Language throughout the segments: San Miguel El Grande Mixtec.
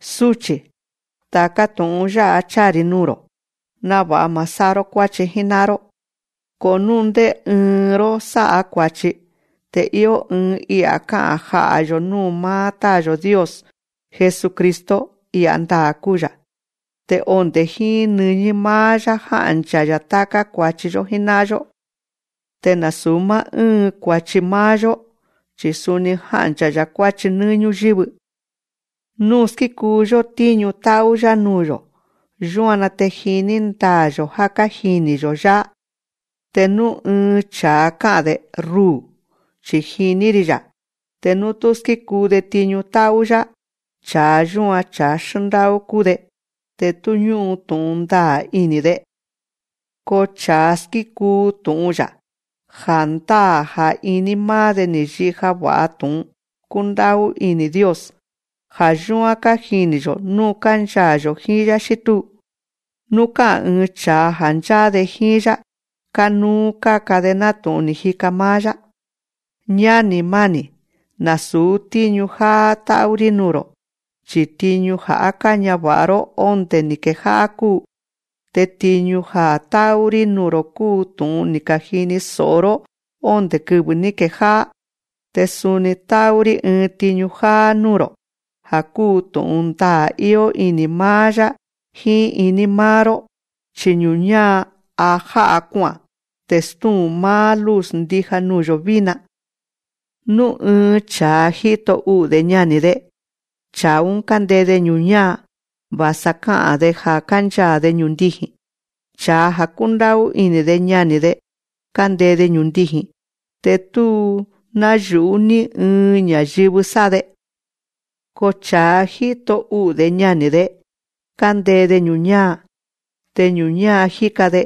Súchi̱, ta̱ká tu̱'un yá'a cháa‑ri̱ nuu̱‑ro̱, náva̱'a ma̱ sá'a‑ró kuáchi jíná'an‑ró. Ko nú ndé ɨɨn‑ró sá'a kua̱chi, te íó ɨɨn I'a̱ ká'a̱n ja'a̱‑yo̱ núu̱ máá Táa̱‑yo̱ Dios. Jesucristo, I'a̱ ndaa̱ kúu‑ya̱. Te onde̱ jíín nɨñí máá‑yá jánchaa̱ ta̱ká kua̱chi‑yó jíná'an‑yó. Te nasu̱ máá ɨ́ɨn kua̱chi máá‑yó, chi̱ suni jánchaa̱ kua̱chi nɨ́ɨ́ ñúyɨ́vɨ. Nú skíkuu‑yó tíñu tá'ú‑yá nuu̱‑yo̱, yúan‑na te jiní ndaa̱‑yo̱ já kájini̱‑yo̱‑yá. Te nú ɨɨn cha̱a ka'a̱n‑de: Ruu̱, chi̱ jiní‑ri̱‑ya̱. Te nú tú skíkuu‑de tiñu tá'ú‑yá, cha̱a yúan, cha̱a xndá'ú kúu‑de, te tú ñú'un tu̱'un ndaa̱ ini̱‑de. Ko cha̱a skíkuu tu̱'un‑ya̱, ja̱ndáa̱ ja̱ iní máá‑de ni̱ yija va̱'a tu̱'un kúndá'ú ini̱ Dios. Ja̱ yúán kájini̱‑yo̱ nú kánchaa̱‑yo̱ jíín‑yá xí túu. Nú ká'a̱n ɨɨn cha̱a ja̱ ncháá‑de jíín‑yá, kánúú káka‑de nátu̱'un ni̱ jika máá‑yá. Ñáni̱ máni̱, nasu̱ tíñu jáá tá'ú‑rí nuu̱‑ro̱, chi̱ tiñu ja̱ á káñava̱'a‑ró ondé ni̱ kejá'á kúu. Te tiñu‑ún ja̱ tá'ú‑rí nuu̱‑ro̱ kúu tu̱'un ni̱ ka̱jini so̱'o‑ró ondé kɨvɨ̱ ní kejá'á. Ko suni tá'ú‑rí ɨɨn tiñu jáá núu̱‑ro̱, ja̱ kúu tu̱'un ndaa̱ íó ini̱ máá‑yá jíín iní máá‑ró. Chi ñu̱ñáa, a já'a kua'a̱n. Te stúu̱n máá luz ndija nuu̱‑yo̱ vína. Nú ɨɨn cha̱a jíto u'u̱‑de ñani̱‑de, cha̱a‑ún kándee‑de ñu̱ñáa, va̱sa a ká'a̱n‑de ja̱ kánchaa̱‑de ñu̱ndiji̱n. Cha̱a ja̱ kúndá'ú ini̱‑de ñani̱‑de, kándee‑de ñu̱ndiji̱n. Te tú náyu̱'ú ni ɨɨn ña̱yɨvɨ sá'a‑de. Ko cha̱a jíto u'u̱‑de ñani̱‑de, kándee‑de ñu̱ñáa. Te ñu̱ñáa jíka‑de,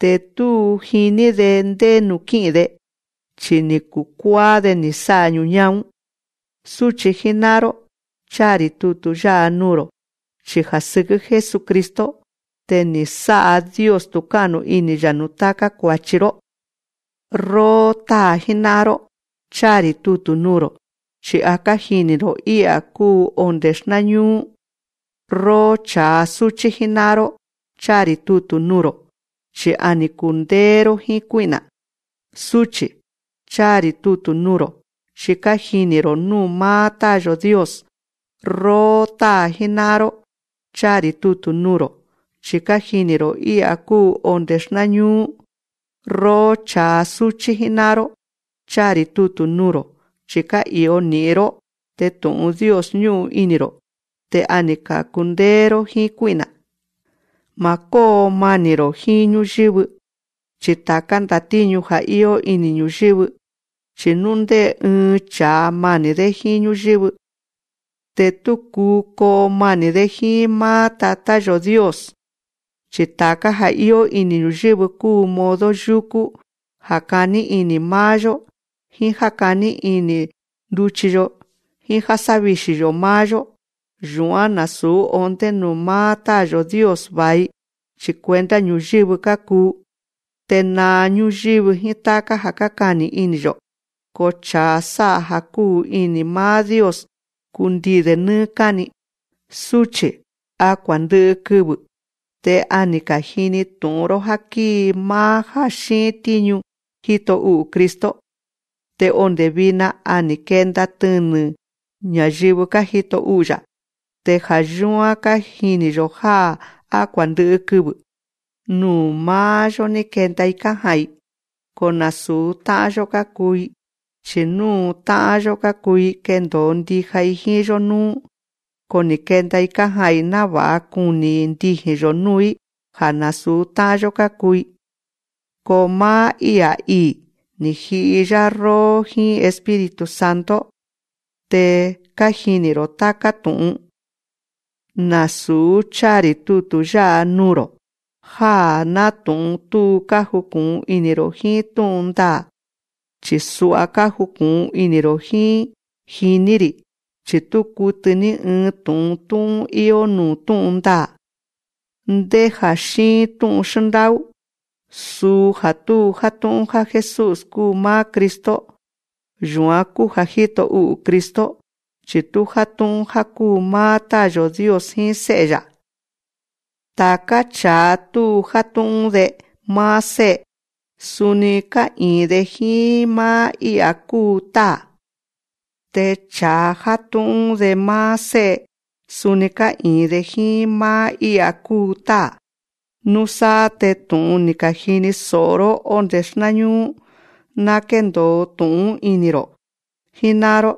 te tú jiní‑de ndé nuu̱ kí'i̱n‑de. Chi ni̱ kukuáá‑de ni̱ sá'a ñu̱ñáa‑ún. Súchi̱ jíná'an‑ró, cháa‑ri̱ tutu̱ yá'a nuu̱‑ro̱ chi ja̱ sɨkɨ́ Jesucristo te ni̱ sá'a Dios tu̱ká'nu ini̱‑ya̱ núu̱ táká kua̱chi‑ró. Róó táa̱ jíná'an‑ró, cháa‑ri̱ tutu̱ nuu̱‑ro̱, chi̱ kájini̱‑ro̱ I'a̱ kúu onde̱ xnáñúú. Róó cha̱a súchí jíná'an‑ró, cháa‑ri̱ tutu̱ nuu̱‑ro̱, chi̱ a ni̱ kundéé‑ró jíín kuí'na̱. Súchi̱, cháa‑ri̱ tutu̱ nuu̱‑ro̱, chi̱ kájini̱‑ro̱ núu̱ máá Táa̱‑yo̱ Dios. Róó táa̱ jíná'an‑ró, cháa‑ri̱ tutu̱ nuu̱‑ro̱, chi̱ kájini̱‑ro̱ I'a̱ kúu onde̱ xnáñúú. Róó cha̱a súchí jíná'an‑ró, cháa‑ri̱ tutu̱ nuu̱‑ro̱, chi̱ ká'i̱o ni̱'in‑ró, te tu̱'un Dios ñú'un ini̱‑ro̱, te a ni̱ ka̱kundéé‑ró jíín kuí'na̱. Ma̱ kóo mani̱‑ro̱ jíín ñúyɨ́vɨ, ni ta̱ká ndatíñu ja̱ íó ini̱ ñu̱yɨ́vɨ. Chi̱ nú ndé ɨɨn cha̱a mani̱‑dé jíín ñúyɨ́vɨ, te tú kúu koo mani̱‑dé jíín máá Táa̱‑yo̱ Dios. Chi ta̱ká ja̱ íó ini̱ ñu̱yɨ́vɨ kúu modo yúkú já kaní ini̱ máá‑yó, jíín já kaní ini̱ nduchi‑yo, jíín já sávixi̱‑yo̱ máá‑yó. Yu̱án násu̱ ondé nuu̱ máá Táa̱‑yo̱ Dios va̱i, chi̱ cuenta ñu̱yɨ́vɨ kákuu. Te naa ñúyɨ́vɨ jíín táká ja̱ kákani̱ ini̱‑yo̱. Ko cha̱a sá'a ja̱ kúu ini̱ máá Dios, kundii̱‑de nɨ́ɨ́ káni. Súchi̱, a kua̱ndɨ'ɨ kɨvɨ̱. Te a ni̱ ka̱jini tu̱'un‑ró já kíi máá já xíin tíñu jíto u'u̱ Cristo. Te onde̱ vina, a ni̱ kenda tɨnɨ̱ ña̱yɨvɨ kájito u'u̱‑ya̱. Te ja̱ yúán kájini̱‑yo̱ já á kua̱ndɨ'ɨ kɨvɨ̱. Nuu̱ máá‑yó ní kenda‑i kája'a̱n‑i. Ko nasu̱ tá'an‑yó kákuu‑i. Chi̱ nú tá'an‑yó kákuu‑i, kendo̱o ndija‑i jíín‑yó núú. Ko ni̱ kenda‑i kája'a̱n‑i náva̱'a kuni̱ ndiji̱n‑yo̱ núu̱‑í ja̱ násu̱ tá'an‑yó kákuu‑i. Ko máá I'a̱ ii̱, ni̱ ji'i‑yá róó jíín Espíritu Santo. Te kájini̱‑ro̱ táká tu̱'un. Nasu̱ cháa‑ri̱ tutu̱ yá'a nuu̱‑ro̱ já nátu̱'un tú kájuku̱'un ini̱‑ro̱ jíín tú'un ndaa̱, chi̱ sua kájuku̱'un ini̱‑ro̱ jíín, jiní‑ri̱, chi̱ tú kutɨ ní ɨɨn tu̱'un tú'ún íó nuu̱ tú'un ndaa̱. Ndé ja̱ xíin tú'un xndá'ú, suu ja̱ tú játu̱'un ja̱ Jesús kúu máá Cristo. Yu̱án kúu ja̱ jíto u'u̱ Cristo, chi̱ tú játu̱'un ja̱ kúu máá Táa̱‑yo̱ Dios jíín Sé'e‑ya̱. Ta̱ká cha̱a tú játu̱'un‑de máá Sé'e, suni tú ká'i̱in‑de jíín máá I'a̱ kúu Táa̱. Te cha̱a játu̱'un‑de máá Sé'e, suni ká'i̱in‑de jíín máá I'a̱ kúu Táa̱. Núsáá te tu̱'un ni̱ ka̱jini so̱'o‑ró ondé xnáñúú, ná kéndo̱o tu̱'un‑ún ini̱‑ro̱ jíná'an‑ró.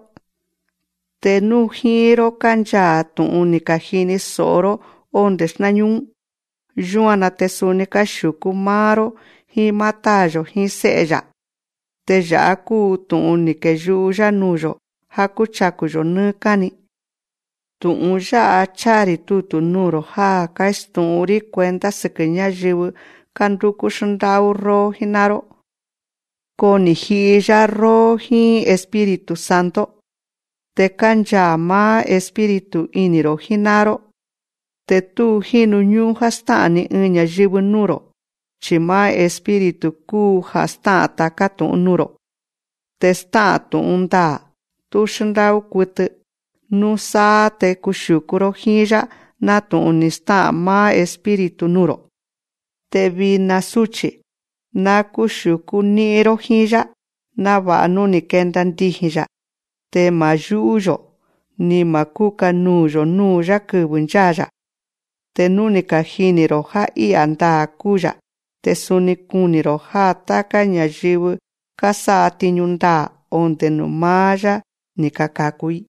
Te nú jíín‑ró kánchaa̱ tu̱'un ni̱ ka̱jini so̱'o‑ró ondé xnáñúú‑ún, yúan‑na te suni kuxiu̱kú máá‑ró jíín máá Táa̱‑yo̱ jíín Sé'e‑ya̱. Te ya̱'á kúu tu̱'un ni̱ keyu'u‑yá nuu̱‑yo̱: Ja̱ kúchaku̱‑yo̱ nɨ́ɨ́ káni. Tu̱'un yá'a cháa‑ri̱ tutu̱ nuu̱‑ro̱ já kástu̱'ún‑rí cuenta sɨkɨ̱ ñáyɨvɨ kándúkú xndá'ú róó jíná'an‑ró. Ko ni̱ ji'i‑yá róó jíín Espíritu Santo, te kánchaa̱ máá Espíritu ini̱‑ro̱ jíná'an‑ró. Te tú kájinu ñú'ún‑ró já stá'a̱n ni ɨɨn ña̱yɨvɨ núu̱‑ro̱, chi̱ máá Espíritu kúu ja̱ stá'a̱n ta̱ká tu̱'un nuu̱‑ro̱, te stá'a̱n tu̱'un ndaa̱, tú xndá'ú kutɨ. Núsáá te kuxiu̱kú‑ró jíín‑yá, nátu̱'un ni̱ stá'a̱n máá Espíritu nuu̱‑ro̱. Te vina súchi̱, ná kúxiu̱kú ní'in‑ró jíín‑yá, náva̱'a nú ni̱ kenda ndiji̱n‑ya̱, te ma̱ yú'ú‑yo̱, ni ma̱ kúka nuu̱‑yo̱ núu̱‑yá kɨvɨ̱ ncháa̱‑ya̱. Te nú kájini̱‑ro̱ já I'a̱ ndaa̱ kúu‑ya̱, te suni ná kuní‑ro̱ já táká ña̱yɨvɨ kásátiñu ndaa̱, onde̱ nuu̱ máá‑yá ni̱ ka̱kaku‑i.